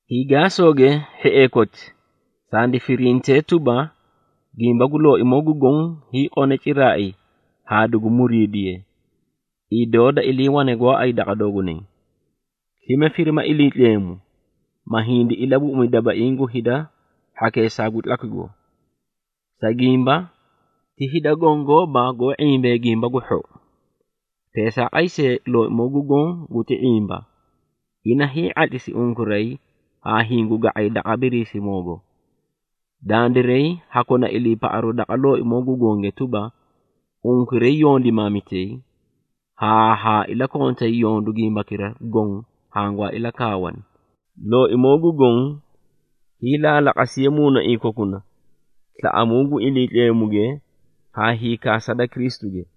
Hiigaasooge, hhiee koti, sandi firintee tuba, gimba gu Looimoo gu Goõ, hiiqone ciraai haa dugu muriidiye, idoo da iliiwane gooay daqa doogunay. Slime, firima Iliitleemu, ma hindi ilabuꞌumi dabaiĩ gu hida hhakeesaa gu tlakwigo. Sa gimba, ti hida gongooba goó ⁄imbee Gimba gu Hhou. Teesaaqay see, Looimoo gu Goõ guti ⁄imba, ina hii⁄atlisi unkuray haa hingu ga⁄ay daqa Biriisimoogo. Dandiray ha kona iliipaꞌaru daqa Looimoo gu Gonge tuba, unkuray yondimaamitay, haa ha ilakontay yondu gimbakira goõ hangwaa ilakaawaani. Looimoo gu Goõ hiilaalaqasiye muunaiĩ kokuna slaꞌamuu gu Iliitleemuge, haa hiikaasa da Kristuge.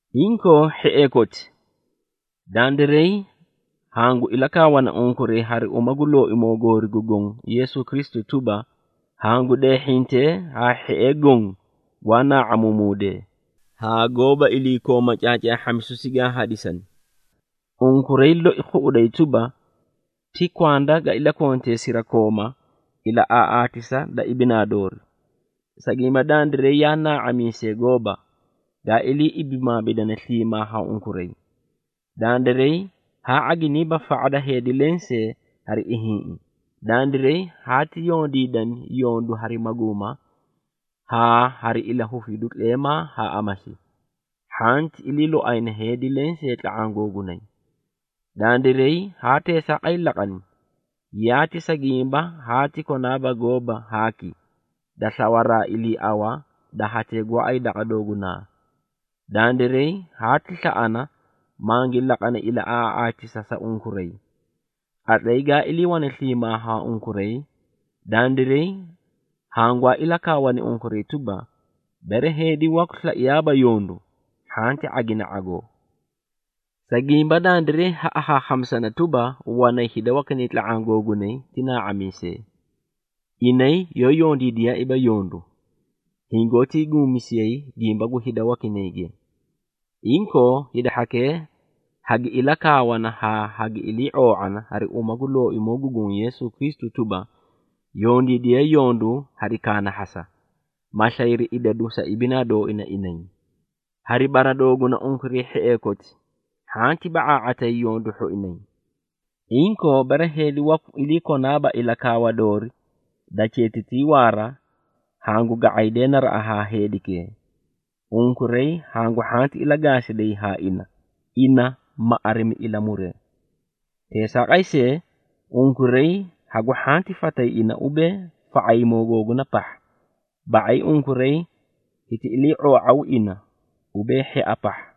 Inkoo hhiee koti, dandiray hangu ilakaawana unkuray hari uma gu Looimoo goori gu Goõ Yeesu Kristu tuba, hangu deehhintee haa hhiee goõ gwaa naa⁄amuumuudee, haa goóba iliikooma caacaahhamisu sigaa hadisani. Unkuray loi khuꞌuday tuba, ti kwanda ga ilakontee sirakooma ilaꞌaaꞌaatisa da ibinaa doorii. Sa gimba, dandiray yaa naa⁄amiisee gooba, gaa ilii ibimaamidane sliimaa haa unkuray. Dandiray haa ⁄aginiiba fa⁄a da heedi leẽ see hari ihiĩꞌi. Dandiray haati yondiidani yondu hari maguuma haa hari ilahufidu tleemaa haa amasi, hhanti iliiloayna heedi lensee tla⁄aã googunay. Dandiray haa teesaaqay laqani, yaati sa gimba haati konaaba gooba haaki, da slawaraa iliiawa da hatee gooay daqa doogunaa. Dandiray haati slaꞌana, mangi laqani ilaꞌaaꞌaatisa sa unkuray. Qatlay gaa iliiwane sliimaa haa unkuray, dandiray hangwaa ilakaawani unkuray tuba, “Bere heedi waku slaiyaaba yondu, hhanti ⁄agina ⁄agoo.” Sa gimba, Dandiray ha akhaakhamisana tuba, wanay hida wakinay tla⁄aã googunay ti naa⁄amiisee. Inay yoó yondiidiyaaiiba yondu, hingoótii guumamisiyay gimba gu hida wakinayge. Inkoo, hida hhakee hagi ilakaawana haa hagi ilii ⁄oo⁄ana, hari uma gu Looimoo gu Goõ Yeesu Kristu tuba, yondiidiyee yondu hari kaanahhasa, ma slayri idadu sa ibinaa dooina inay. Hari bara dooguna unkuray hhiee koti, hhanti ba⁄aa⁄atayi yondu hhoinay. Inkoo, bere heedi waku ilii konaaba ilakaawa doori da cheetitii waara, hangu ga⁄aydee naraꞌa haa heedikee. Unkuray hangu hhanti ilagaasiday haa ina, ina ma arimi ilamuree. Teesaaqay see, unkuray hagu hhanti fatay ina ubee, fa⁄ayimoo googuna pahha, ba⁄ay unkuray hiti ilii⁄oo⁄aw ina ubee hhia pahha.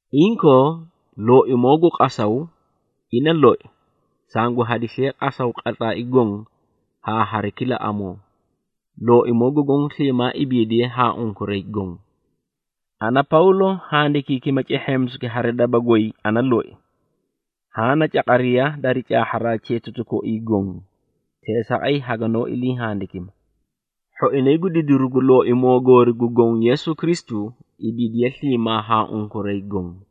Inkoo, Looimoo gu qasaw ina loi, sangu hadisiye qasaw qatlaai goõ haa hari kila amoo. Looimoo gu Goõ sliimaa ibiidiye haa unkuray goõ. Ana, Pawlo handikiikima cehheemisuki hari daba goy ana loi. Haã na caqariya dari caahharaa cheetatu koii goõ, teesaaqay haganoó ilii handikima. Hhoinay gu didiru gu Looimoo goori gu Goõ Yeesu Kristu, ibiidiye sliimaa haa unkuray goõ.